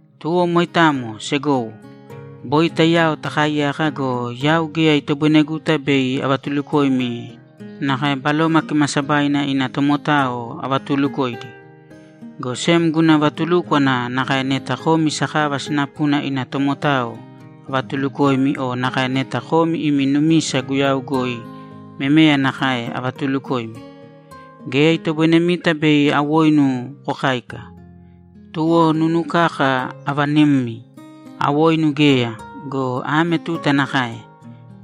Tuwo moitamo, segowo, boi taiyao takaaiyaka go, yau geya itoboineguta bei avatulukoimi nakae Baloma Kimaasabaina ina tomotao avatuulukoidi. Go sem guna vatulúkwana nakae neta komi sakava sinapuna ina tomotao avatuulukoimi o nakae neta komi imi numisa Guyau goi memeya nakae avatuulukoimi. Geya itoboinemita bei awoinu kokáika. Tuwo nunu kaka avanimmi, awoinu geya go, ame tuta nakae;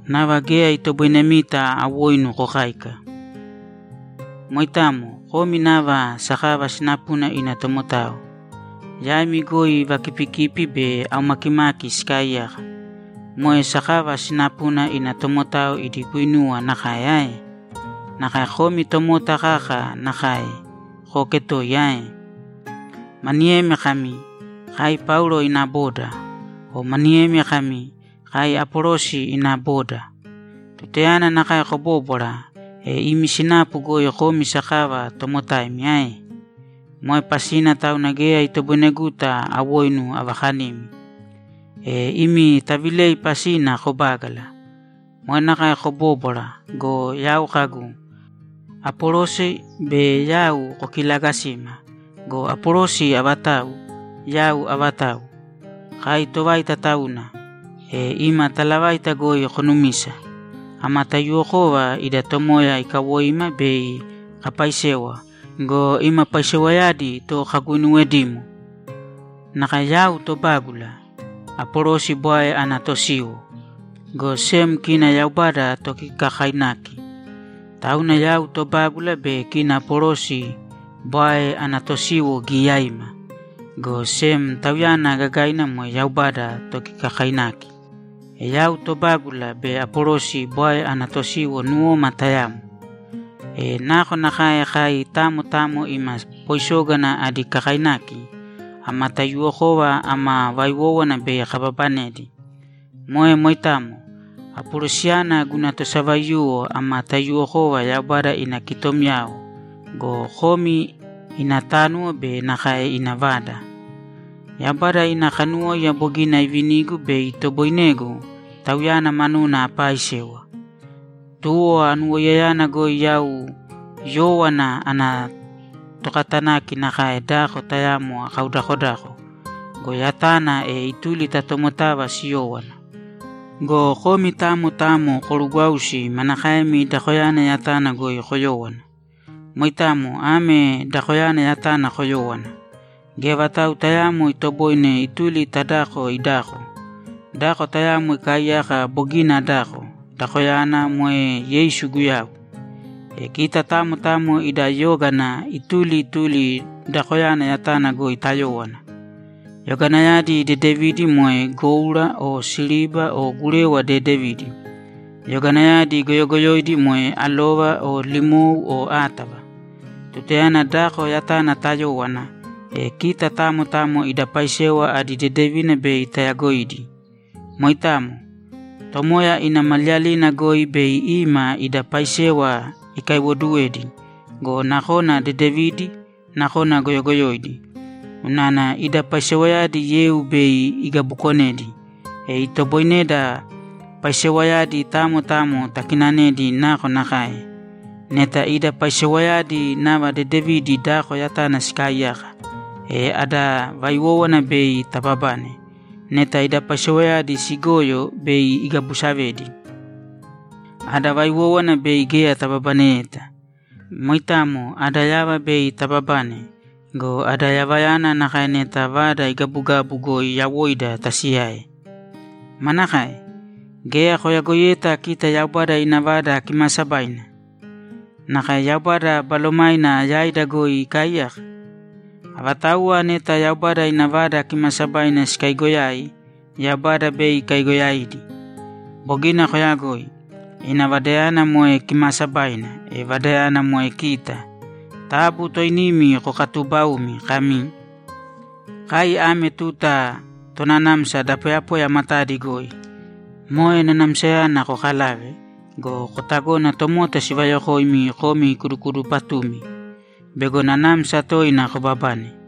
nava geya itoboinemita awoinu kokáika. Moitamo. Komi nava sakava sinapuna ina tomotao. Yaimi goi vakipikipi be aumakimaki sikaaiyaka. Moe sakava sinapuna ina tomotao idi guinuwa nakae ae? Nakae komi tomota kaka nakae kooketoiya ae? Maniyemi kami, ‘Kai Paulo ina boda.’ O maniyemi kami, ‘Kai Apolosi ina boda.’ Tutayana nakae kobóbwara, e imi sinapu goi komi sakava tomotaimi ae? Moe pasina tauna geya itoboineguta awoinu avakanimi. E imi tavilei pasina kobágala. Moe nakae kobóbwara go, yau kagu, ‘Apolosi be yau kokilaagasima go, Apolosi avatau? Yau avatau?’ Kai tovaita tauna, e ima talavaita goi konumisa. Ama taiyuwokova ida Tomoya ikawoima bei kapaisewa go, ima paisewayadi to kaguinuwedimo. Nakae yau tobágula, Apolosi bwae ana tosiwo, go sem kina Yaubada tokikakainaki. Tauna yau tobágula be kina Apolosi bwae ana tosiwo giyaiima, go sem Tauyana gagaina moe Yaubada tokikakainaki. E yau tobágula be Apolosi bwae ana tosiwo nuwoma tayamo. E nakonakae kai tamo tamo ima poisógana adi kakainaki, ama taiyuwokova ama vaiwówana bei kababanedi. Moe moitamo. Apolosiyana guna tosavaiyuwo ama taiyuwokova Yaubada ina kitomyao go, komi ina tánuwo be nakae ina vada. Yaubada ina kanuwóiya bogina ivinigu bei itoboinegu Tauyana manuna apaaisewa. Tuwo anuwoiyayana goi yau yówana ana tokatanaki nakae dako tayamo akaudakodako go, yatana, e ituli ta tomotava siyówana. Go komi tamo tamo korugwāusi manakaemi dakoyana yatana goi koyówana. Moitamo ame dakoyana yatana koyōwo. Geya vatau tayaamo itoboine ituli ta dako idako. Dako tayamo ikaaiyaka bogina adako; dakoyana moe Yeisu Guyau. E kita tamo tamo ida yógana ituli ituli dakoyana yatana goi tayówana. Yoganayadi dedevidi moe goura o siriba o gurewa dedevidi; yoganayadi goyogoyoidi moe alova o limou o átava. Tutayana dako yatana tayówana, e kita tamo tamo ida paisewa adi dedevina bei tayagoidi. Moitamo. Tomoya ina Maliyalina goi bei ima ida paisewa ikaiwoduwedi go, nakona dedevidi, nakona goyogoyoidi. Unana ida paisewayadi yeu bei igabukonedi, e itoboineda paisewayadi tamo tamo takinanedi nakonakae. Neta ida paisewayadi nava dedevidi dako yatana sikaaiyaka, e ada vaiwówana bei tababane. Neta ida paisewayadi sigoyo, bei igabusavedi. Ada vaiwówana bei geya tababaneyeta. Moitamo ada yava bei tababane go, ada yavayana nakae neta vada igabugabu goi yawoida tasiyae. Manakae? Geya koyagoiyeta kita Yaubada ina Vada Kimaasabaina? Nakae Yaubada Balomaina yaida goi ikaaiyaka? Avatauwa neta Yaubada ina Vada Kimaasabaina sikaigoyai, Yaubada bei ikaigoyaidi. Bogina koyagoi. Ina Vadayana moe kimaasabaina, e vadayana moe kita. Taabu toinimi kokatuubaūmi kami, ‘Kai ame tuta tonanamsa da poyapoya matadi goi.’ Moe nanamsayana kokalāve go, kotagōna tomota sivayokoimi komi kudukudupatumi bego nanamsa toina kobabane.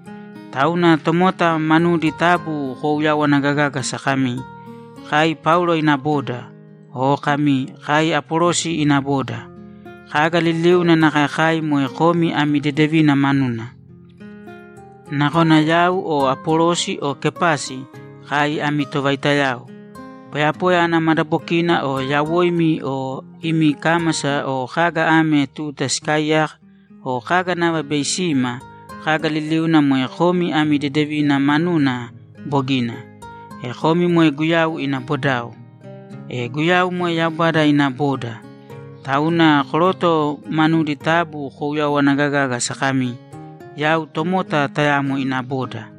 Tauna, tomota manudi taabu kouyawana gagāgasa kami, ‘Kai Paulo ina boda.’ O kami, ‘Kai Apolosi ina boda.’ Kaga liliuna nakae kai moe komi ami dedevina manuna. Nakona yau o Apolosi o Kepasi, kai ami tovaitayao. Poyapoya ana madabokina o yawoimi o imi kámasa o kaga ame tuta sikaaiyaka o kaga nava bei sima, kaga liliuna moe komi ami dedevina manuna bogina. E komi moe Guyau ina bodao. E Guyau moe Yaubada ina boda. Tauna koroto manudi taabu kouyawana gagāgasa kami, ‘Yau tomota tayamo ina boda.’